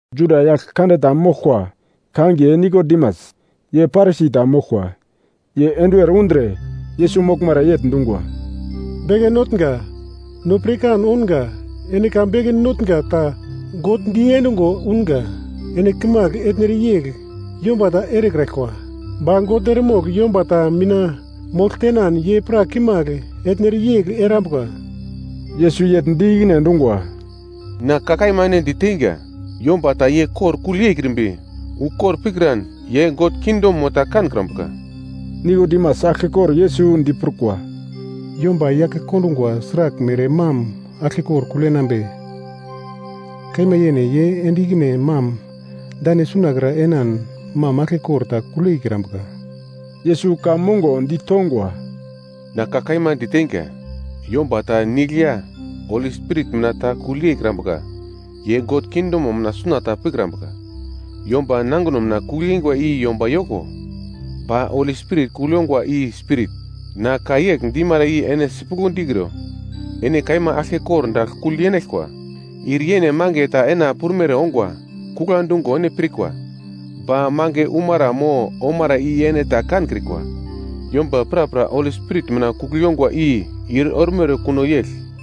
Juda yagl kande ta moglkwa kangiye Nikodimas, ye Parisi ta moglkwa. Ye enduwer undre, Yesus moglmara yegl dungwa, “Beke Notnga, no pirkan ounga ene ka beke notnga ta God di endungo unga, ene kimagl etnere yegl yomba ta erekraglkwa, ba God eremogl yomba ta mina mogl tenan ye pra kimagl etnere yegl erambuka.” Yesus yegl di ikine endungwa, “Na ka kaima ene di teinga, yomba ta ye kor kugl yeikrimbi ukor pikran ye God kingdomo ta kankrambuka.” Nikodimas aglkekor Yesus diprukwa, “Yomba yake kondungwa sraglmere mam aglkekor kugl yenambe? Kaima yene ye ende ikine mam dane suna kra enan mam aglkekor ta kugl yeikrambuka!” Yesus ka mongo ditongwa, “Na ka kaima diteinga, yomba ta nigl ya Holi Spirit mina ta kugl yeikrambuka, ye God kingdomo mina suna ta pikrambuka. Yomba nangino mina kugl yeingwa i yomba yoko, ba Holi Spirit kugl yongwa i spirit. Na ka yegl dimara i ene sipuglo dikro, ‘Ene kaima aglke kordagl kugl yenaglkwa.’ Ir yene mange ta ena prumere ongwa, kugla dungo ene pirkwa, ba mange umara mo omara i ene ta kankrikwa. Yomba prapra Holi Spirit mina kugl yongwa i ir ormere kuno yegl.”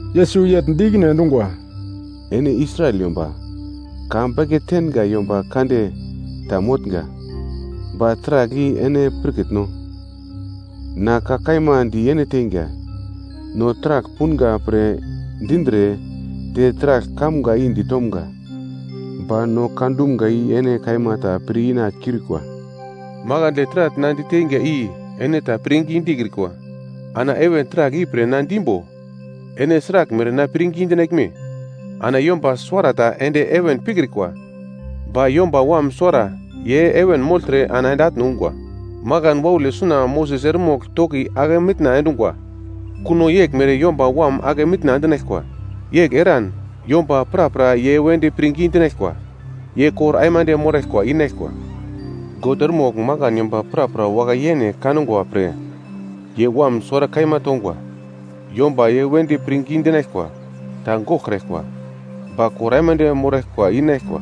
Yesus yegl di ikine endungwa, “Ene Israel yomba ka beke tenga yomba kande ta motnga, ba taragl i ene pirkitno? Na ka kaima di ene teinga, no taragl punga pre dindre te taragl kamga i ditomga. Ba no ka dumga i ene kaima ta pir ina kiurikwa. Makandle taragl na diteinga i ene ta pirngi dikrikwa, ana heven taragl i pre na dimbo ene sraglmere na pirngi dinaglme? Ana yomba suwarata ende heven pikrikwa, ba Yomba Wam suwara ye heven mogltre ana ende atne ungwa. Makan waule suna Moses eremogl toki ake mitna endungwa, kuno yeglmere Yomba Wam ake mitna endinaglkwa. Yegl eran yomba prapra ye wedi pirngi dinaglkwa, ye kor aimande moraglkwa inaglkwa. “God eremogl makan yomba prapra wakai-yene kangwa pre, ye Wam suwara kaima tongwa. Yomba ye wedi pirngi dinaglkwa ta goglkraglkwa, ba kor aimande moraglkwa inaglkwa.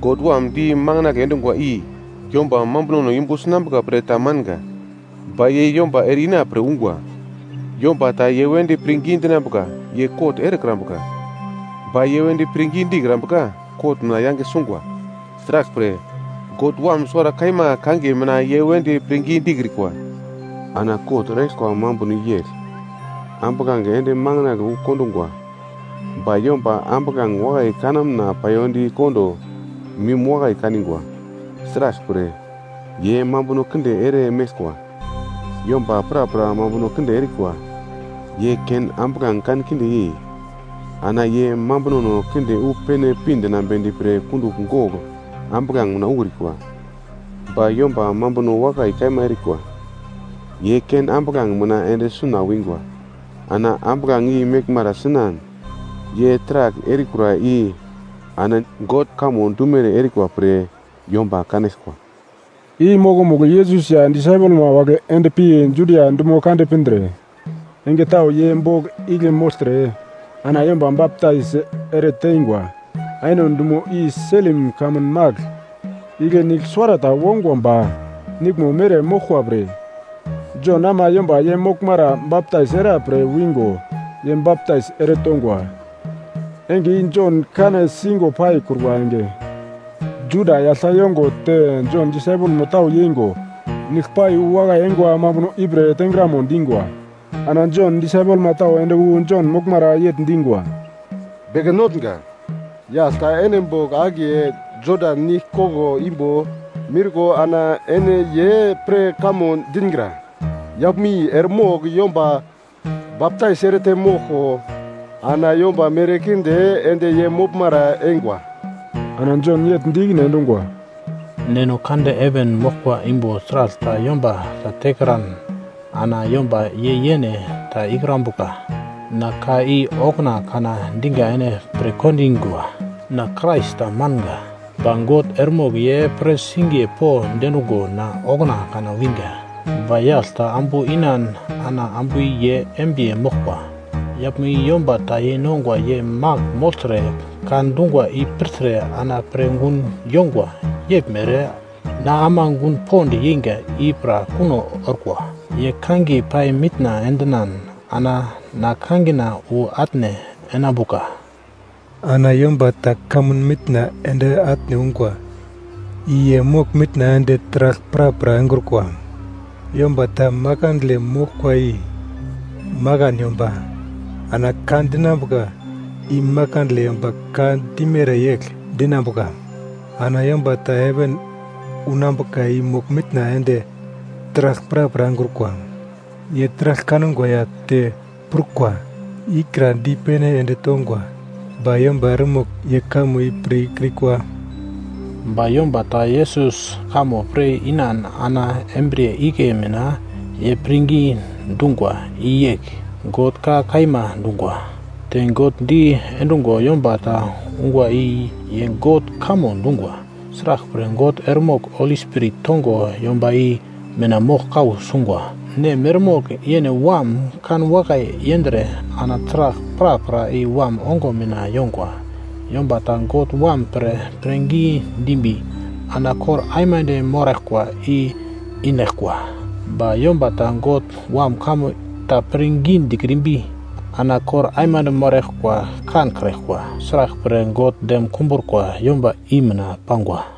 God Wam di manginagle endungwa i yomba mambunono yumbu sinambuka pre ta manga, ba ye yomba ere-ina pre ungwa. Yomba ta ye wedi pirngi dinambuka ye kot erekrambuka, ba ye wedi pirngi dikrambuka kot mina yange sungwa. Sraglpre God Wam suwara kaima kangiye mina ye wedi pirngi dikrikwa. Ana kot eraglkwa mambuno i yegl, ambuglange ende makandle wu kondungwa, ba yomba ambuglange wakai kanamna payondi kondo mim wakai kanigwa, sraglpre ye mambuno kinde ere meglkwa. Yomba prapra mambuno kinde erikwa, ye ken ambuglange kankinde yei, ana ye mambunono kinde wu pene pi dinambedi pre kundugl gogl ambuglange mina ukrikwa. Ba yomba mambuno wakai kaima erikwa ye ken ambuglange mina ende suna wingwa, ana ambuglange i meglmara sinan, ye taragl erikura i ana God kamo dumere erikwa pre yomba kanaglkwa.” I mokomugl Yesus ya disaipelma wagle ende pi Judia dumo kande pindre enge tau ye bogl igle mogltre, ana yomba baptais ere teingwa. Ainon dumo i Selim kamun magl, igle nigl suwarata wongwa ba niglmo mere moglkwa pre, Jon ama yomba ye moglmara baptais era pre wingo ye baptais ere tongwa. (Enge i Jon kane singo paikrukwa enge.) Juda yagl ta yongo te Jon disaipelmo tau yeingo nigl pai wu wakai eingwa mambuno i pre tengramo dingwa. Ana Jon disaipelma tau ende wu Jon moglmara yegl dingwa, “Beke Notnga, yagl ta ene bogl akiye Jodan Nigle koglo imbo miurko ana ene ye pre kamo dingra, yaglmo i eremogl yomba baptais erete moglko ana yomba merkinde ende ye moglmara eingwa.” Ana Jon yegl di ikine endungwa, “Neno kande heven moglkwa imbo taragl ta yomba tekran ana yomba ye yene ta ikrambuka. Na ka i okuna kana dinga ene pirkondingwa, ‘Na Krais ta manga. Ba God eremogl ye pre singiye po diendungo na okuna kana winga.’ Ba yagl ta ambu inan ana ambu i ye embiye moglkwa. Yaglmo i yomba ta yeinongwa ye magl mogltre ka dungwa i pirtre ana pir gun yongwa yeglmere na ama gun pond yeinga i pra kuno orkwa. Ye kangiye pai mitna endinan ana na kangina wu atne enambuka. “Ana yomba ta kamun mitna ende atne ungwa i ye mogl-mitna ende taragl prapra engrukwa. Yomba ta makandle moglkwa i makan yomba, ana ka dinambuka i makandle yomba ka dimere yegl dinambuka. Ana yomba ta heven unambuka i mogl-mitna ende taragl prapra engrukwa. Ye taragl kangwa ya te prukwa i kra dipene ende tongwa, ba yomba eremogl ye kamo i pir ikrikwa. Ba yomba ta Yesus kamo pir inan ana embriye igle mina ye pirngi dungwa, i yegl, ‘God ka kaima dungwa.’ Te God di endungwa yomba ta ungwa i ye God kamo dungwa, sraglpre God eremogl Holi Spirit tongo yomba i mina mogl kau sungwa. Nem eremogl yene Wam kanwakai yendre, ana taragl prapra i Wam ongo mina yongwa. Yomba ta God Wam pre pirngi dimbi, ana kor aimande moraglkwa i inaglkwa. Ba yomba ta God Wam kamo ta pirngi dikrimbi ana kor aimande moraglkwa kankraglkwa. Sraglpre God dem kumbrukwa yomba i mina pangwa.”